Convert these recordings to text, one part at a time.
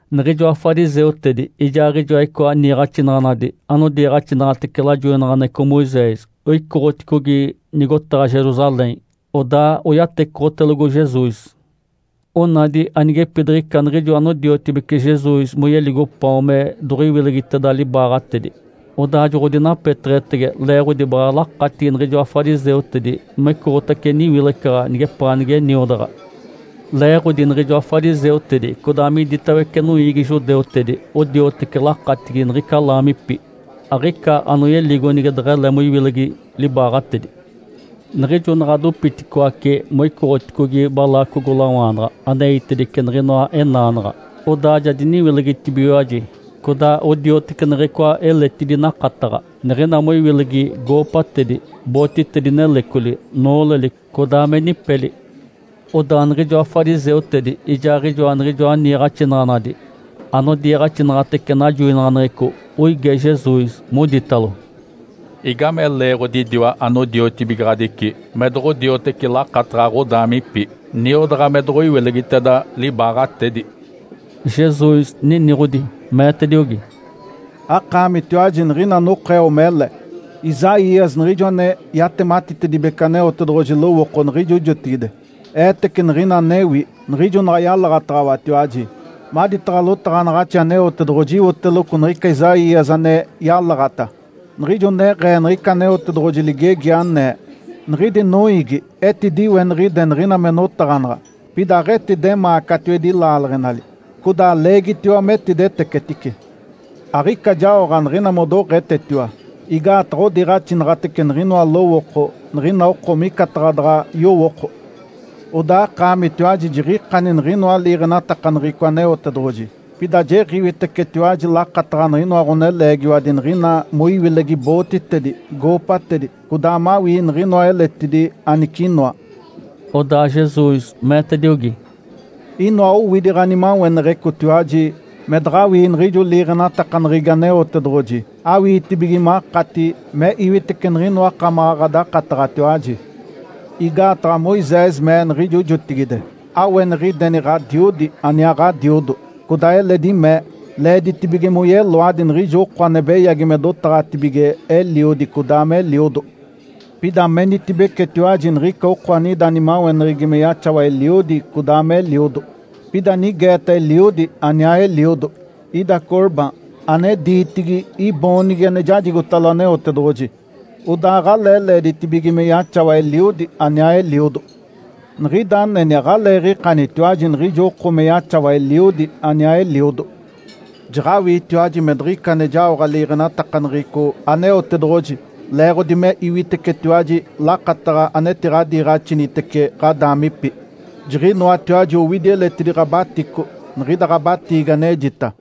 Niɡ̶ijoa fariseutedi ijaaɡ̶ijoa icoa niiɡ̶axinaɡ̶anadi anodiiɡ̶axinaɡ̶atece lajoinaɡ̶aneɡ̶eco Moisés oicoɡ̶oticogi nigotaɡ̶a Jerusalém. Odaa oyatecoɡ̶otelogo Jesus. Onadi anigepidiɡ̶ica niɡ̶ijo anodiotibece Jesus moyeligo paon me doɡ̶oiwilegiteda libaaɡ̶atedi, odaa joɡ̶odinapeteɡ̶etege, leeɡ̶odi baɡ̶a lakatigi niɡ̶ijoa fariseutedi mecoɡ̶otace niwilecaɡ̶a nigepaa nige niodaɡ̶a. Leeɡ̶odi niɡ̶ijoa fariseutedi codaa miditawece noiigi judeutedi odioteci lakatigi niɡ̶ica laamipi. Aɡ̶ica anoyeligo nige deɡ̶ele moiwilegi libaaɡ̶atedi. Niɡ̶ijo naɡ̶a dopiticoace moicoɡ̶oticogi balaacogolawaanaɡ̶a aneitedice niɡ̶inoa enaanaɡ̶a, odaa ja diniwilegitibigiwaji. Codaa odioteci niɡ̶icoa eletidi nakataɡ̶a, niɡ̶ina moiwilegi goopatedi, bootitedi nelecoli, nooleli, codaa me nipeli. Odaa niɡ̶ijoa fariseutedi ijaaɡ̶ijoa niɡ̶ijoa niiɡ̶axinaɡ̶anadi anodiiɡ̶axinaɡ̶atece najoinaɡ̶aneɡ̶eco oige Jesus, moditalo, “Igame leeɡ̶odi idiwa anodiotibigaɡ̶adici me doɡ̶odioteci lakataɡ̶a ɡ̶odaamipi, niodaɡ̶a me doɡ̶oiwilegiteda libaaɡ̶atedi?” Jesus niniɡ̶odi, meetediogi, “Akaamitiwaji niɡ̶ina anokeo mele! Isaías, niɡ̶ijo ane yatematitedibece Aneotedoɡ̶oji lowooko niɡ̶ijo jotigide, eetece niɡ̶ina anewi, niɡ̶ijo naɡ̶a yalaɡ̶ataɡ̶awatiwaji. Maditaɡ̶a lotaɡ̶anaɡ̶axi Aneotedoɡ̶oji iwoteloco niɡ̶ica Isaías ane yalaɡ̶ata, niɡ̶ijo neɡ̶ee niɡ̶ica Aneotedoɡ̶oji ligegi, anee, ‘Niɡ̶idi noiigi etidiweniɡ̶ide niɡ̶ina me notaɡ̶anaɡ̶a, pida aɡ̶etidemaa catiwedi laaleɡ̶enali, codaa leegitiwa metidetecetice. Aɡ̶ica jaoɡ̶a niɡ̶ina modoɡ̶etetiwa, igaataɡ̶a odiiɡ̶axinaɡ̶atece niɡ̶inoa lowooko niɡ̶ina oko micataɡ̶a daɡ̶a yowooko.’ Odaa akaamitiwaji jiɡ̶ikani niɡ̶inoa liiɡ̶enatakaneɡ̶eco Aneotedoɡ̶oji, pida jiɡ̶iwitecetiwaji lakataɡ̶a niɡ̶inoa ɡ̶oneleegiwadi niɡ̶ina moiwilegi bootitedi, goopatedi, codaa mawii niɡ̶inoa eletidi anicinoa.” Odaa Jesus meetediogi, “Inoa owidi ɡ̶animaweneɡ̶ecotiwaji me daɡ̶awii niɡ̶ijo liiɡ̶enatakaneɡ̶egi Aneotedoɡ̶oji awiitibige makati me iwitece niɡ̶inoa akamaɡ̶a ɡ̶adakataɡ̶atiwaji. Igaataɡ̶a Moisés mee niɡ̶ijo jotigide, ‘Aweniɡ̶ideni ɡ̶adiodi aniaa ɡ̶adiodo!’ Codaa eledi mee, ‘Leeditibige moyeloadi niɡ̶ijo oko ane beyagi me dotaɡ̶atibige eliodi codaa me eliodo.’ Pida menitibecetiwaji nigica oko anida nimaweneɡ̶egi me yaxawa eliodi codaa me eliodo, pida nigeeta eliodi aniaa eliodo, ‘Ida Corban’ (ane diitigi ‘iboonigi ane jajigotalo Aneotedoɡ̶oji’). Odaa aɡ̶alee leeditibige me yaxawa eliodi aniaa eliodo. Niɡ̶ida aneni aɡ̶aleeɡ̶ikanitiwaji niɡ̶ijo oko me yaxawa eliodi aniaa eliodo. Jaɡ̶awiitiwaji me diɡ̶ica ane jaoɡ̶a liiɡ̶enatakaneɡ̶eco Aneotedoɡ̶oji leeɡ̶odi me iwitecetiwaji lakataɡ̶a anetiɡ̶adiiɡ̶axinitece ɡ̶adaamipi. Jiɡ̶inoatiwaji owidi eletidi ɡ̶abatico niɡ̶ida ɡ̶abatiigi anejita.”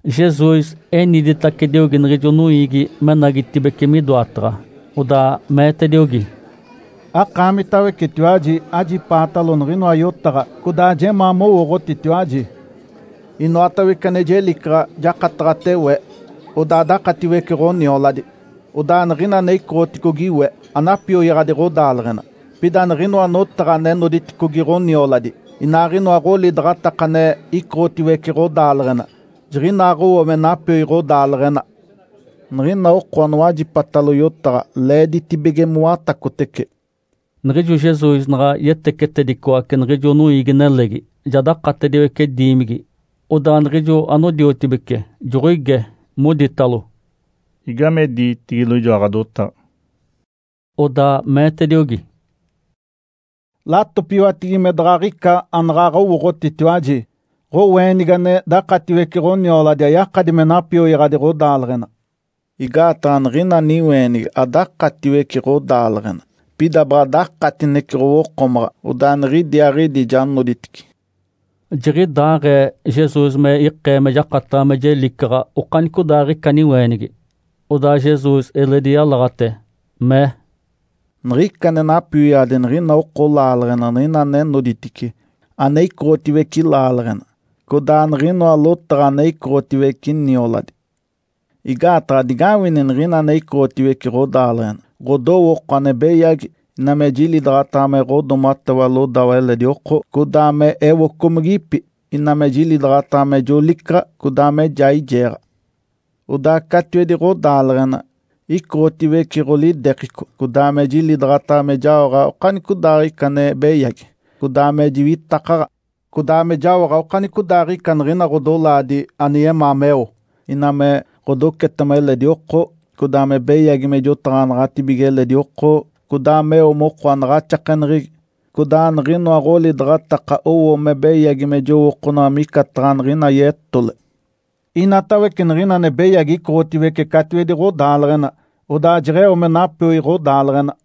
Jesus eniditacediogi niɡ̶ijo noiigi menagitacibeci midoataɡ̶a, odaa meetediogi, “Akaamitawecetiwaji, ajipaatalo niɡ̶inoa yotaɡ̶a, codaa jemaa mowooɡ̶otitiwaji! Inoatawece ane jelicaɡ̶a jakataɡ̶ate we, odaa dakatiwece ɡ̶onioladi. Odaa niɡ̶ina ane icoɡ̶oticogi we anapioyaɡ̶adi ɡ̶odaaleɡ̶ena. Pida niɡ̶inoa notaɡ̶a ane noditedicogi ɡ̶onioladi, inaaɡ̶inoa ɡ̶olidaɡ̶ataka ane icoɡ̶otiwece ɡ̶odaaleɡ̶ena, jiɡ̶inaaɡ̶owo me napioi ɡ̶odaaleɡ̶ena. Niɡ̶ina oko anowajipatalo yotaɡ̶a leeditibige mowatacotece.” Niɡ̶ijo Jesus naɡ̶a yetecetedicoace niɡ̶ijo noiigi-nelegi, ja dakatediwece diimigi, odaa niɡ̶ijo anodiotibece joɡ̶oige, moditalo, “Igame diitigilo ijoa ɡ̶adotaɡ̶a.” Odaa meetediogi, “Latopiwatigi me daɡ̶aɡ̶ica anaɡ̶aɡ̶a owooɡ̶otitiwaji. Ǥoweenigi ane dakatiwece ɡ̶onioladi ayakadi me napioyaɡ̶adi ɡ̶odaaleɡ̶ena. Igaataɡ̶a niɡ̶ina niweenigi adakatiwece ɡ̶odaaleɡ̶ena, pida baɡ̶a dakatinece ɡ̶owokomaɡ̶a, odaa niɡ̶idiaaɡ̶idi ja noditice.” (Jiɡ̶idaaɡ̶ee Jesus me ikee me jakataɡ̶a me jelicaɡ̶a okanicodaaɡ̶ica niweenigi.) Odaa Jesus eledi yalaɡ̶ate, mee, “Niɡ̶ica ane napioyaɡ̶adi niɡ̶ina oko laaleɡ̶ena niɡ̶ina ane noditice, ane icoɡ̶otiwece laaleɡ̶ena, codaa niɡ̶inoa lotaɡ̶a ane icoɡ̶otiwece nioladi. Igaataɡ̶a digawini niɡ̶ina ane icoɡ̶otiwece ɡ̶odaaleɡ̶ena; ɡ̶odowooko ane beyagi, ina me jilidaɡ̶ataɡ̶a me ɡ̶odoomatewa lodawa eledi oko, codaa me ewocomigipi, ina me jilidaɡ̶ataɡ̶a me jolicaɡ̶a, codaa me jaijeeɡ̶a. Odaa catiwedi ɡ̶odaaleɡ̶ena icoɡ̶otiwece ɡ̶olidekico, codaa me jilidaɡ̶ataɡ̶a me jaoɡ̶a okanicodaaɡ̶ica ane beyagi, codaa me jiwitakaɡ̶a, codaa me jaoɡ̶a okanicodaaɡ̶ica niɡ̶ina ɡ̶odolaadi ane yemaa meo, ina me ɡ̶odocetema eledi oko, codaa me beyagi me jotaɡ̶anaɡ̶atibige eledi oko, codaa meo moko anaɡ̶axakeneɡ̶egi, codaa niɡ̶inoa ɡ̶olidaɡ̶ataka owo me beyagi me jowookonaɡ̶a micataɡ̶a niɡ̶ina yetole. Inatawece niɡ̶ina ane beyagi icoɡ̶otiwece catiwedi ɡ̶odaaleɡ̶ena, odaa jeɡ̶eo me napioi ɡ̶odaaleɡ̶ena.”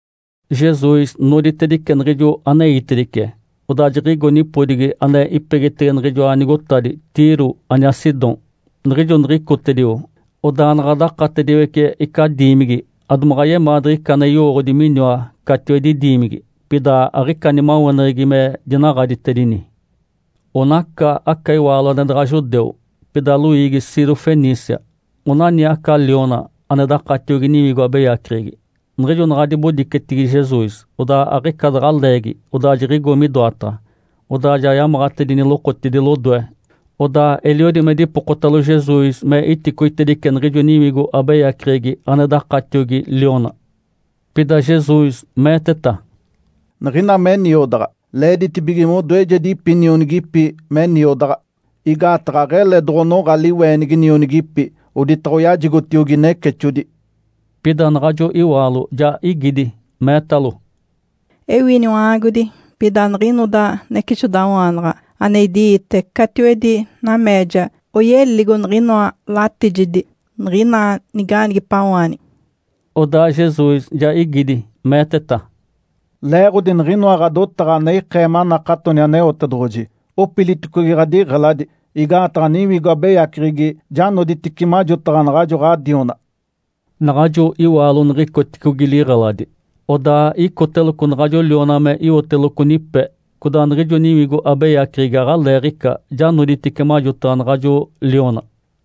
Jesus noditedice niɡ̶ijo aneitedice, odaa jiɡ̶igo nipodigi ane ipegitege niɡ̶ijoa nigotadi Tiro aniaa Sidom. Niɡ̶ijo niɡ̶icotedio, odaa naɡ̶a dakatediwece ica diimigi, adomaɡ̶a yemaa diɡ̶ica ane yowooɡ̶odi miniwa catiwedi diimigi. Pida aɡ̶ica nimaweneɡ̶egi me dinaɡ̶aditedini. Onaca aca iwaalo ane daɡ̶a judeu, pida loiigi siro-fenícia. Onani aca liona ane dakatiogi niwigo abeyaceɡ̶egi. Niɡ̶ijo naɡ̶a dibodicetigi Jesus, odaa aɡ̶ica daɡ̶a leegi, odaa jiɡ̶igo midoataɡ̶a, odaa ja yamaɡ̶atedini lokotidi lodoe. Odaa eliodi me dipokotalo Jesus me iticoitedice niɡ̶ijo niwigo abeyaceɡ̶egi ane dakatiogi liona. Pida Jesus meeteta, “Niɡ̶ina me niodaɡ̶a, leeditibige modoejedipi nionigipi me niodaɡ̶a. Igaataɡ̶a aɡ̶ele doɡ̶onoɡ̶a liweenigi nionigipi, oditaɡ̶a oyajigotiogi necexodi.” Pida naɡ̶ajo iwaalo ja igidi, meetalo, “Ewi, Iniwa-aagodi. Pida niɡ̶inoda necexodawaanaɡ̶a ane idi-iite catiwedi nameeja oyeligo niɡ̶inoa latijedi niɡ̶ina niga-aanigipawaanigi.” Odaa Jesus ja igidi, meeteta, “Leeɡ̶odi niɡ̶inoa ɡ̶adotaɡ̶a ane ikee manakatoni Aneotedoɡ̶oji, opiliticogi ɡ̶adiɡ̶eladi, igaataɡ̶a niwigo abeyaceɡ̶egi ja noditice majotaɡ̶a naɡ̶ajo ɡ̶adiona.” Naɡ̶ajo iwaalo niɡ̶icoticogi liɡ̶eladi, odaa icoteloco naɡ̶ajo liona me iwoteloco nipe, codaa niɡ̶ijo niwigo abeyaceɡ̶egi aɡ̶aleeɡ̶ica, ja noditice majotaɡ̶a naɡ̶ajo liona.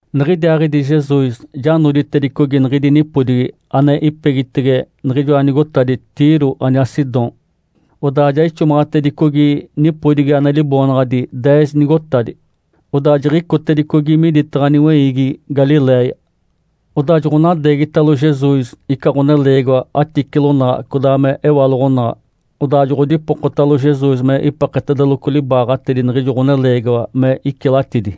Niɡ̶idiaaɡ̶idi Jesus ja noditedicogi niɡ̶idi nipodigi ane ipegitege niɡ̶ijoa nigotadi Tiro aniaa Sidom, odaa ja ixomaɡ̶atedicogi nipodigi ane liboonaɡ̶adi “Deez nigotadi”, odaa jiɡ̶icotedicogi miditaɡ̶a niweiigi Galiléia. Odaa joɡ̶onadeegitalo Jesus ica ɡ̶oneleegiwa aticilonaɡ̶a codaa me ewaloɡ̶onaɡ̶a, odaa joɡ̶odipokotalo Jesus me ipeketedeloco libaaɡ̶atedi niɡ̶ijo ɡ̶oneleegiwa me icilatidi.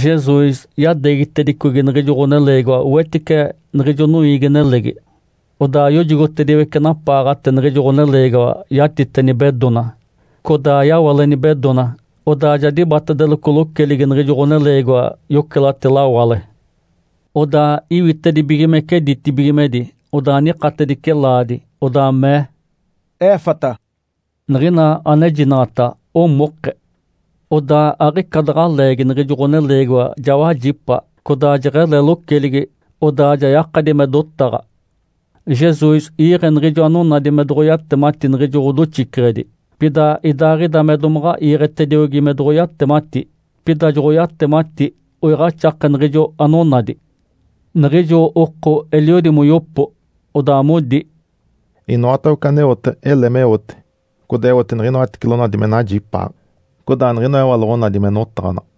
Jesus yadeegitedicogi niɡ̶ijo ɡ̶oneleegiwa wetice niɡ̶ijo noiigi-nelegi, odaa yojogotediwece napaaɡ̶ate niɡ̶ijo ɡ̶oneleegiwa yatite nibedona. Codaa yawale nibedona, odaa ja dibatedeloco loceligi niɡ̶ijo ɡ̶oneleegiwa yocelate lawale. Odaa iwitedibigimece ditibigimedi, odaa nikatedice laadi. Odaa mee, “Efatá!” niɡ̶ina anejinaɡ̶ata, “Omoke!” Odaa aɡ̶ica daɡ̶a leegi niɡ̶ijo ɡ̶oneleegiwa ja wajipa, codaa jeɡ̶ele loceligi, odaa ja yakadi me dotaɡ̶a. Jesus iiɡ̶e niɡ̶ijo anonadi me doɡ̶oyatemati niɡ̶ijo ɡ̶odoxiceɡ̶edi. Pida idaaɡ̶ida me domaɡ̶a iiɡ̶etediogi me doɡ̶oyatemati, pida joɡ̶oyatemati oiɡ̶axake niɡ̶ijo anonadi. Niɡ̶ijo oko eliodi moyopo, odaa modi, “Inoatawece aneote, ele meote. Codaa eote niɡ̶inoa aticilonadi me najipaaɡ̶a, codaa niɡ̶inoa ewaloɡ̶onadi me notaɡ̶anaɡ̶a!”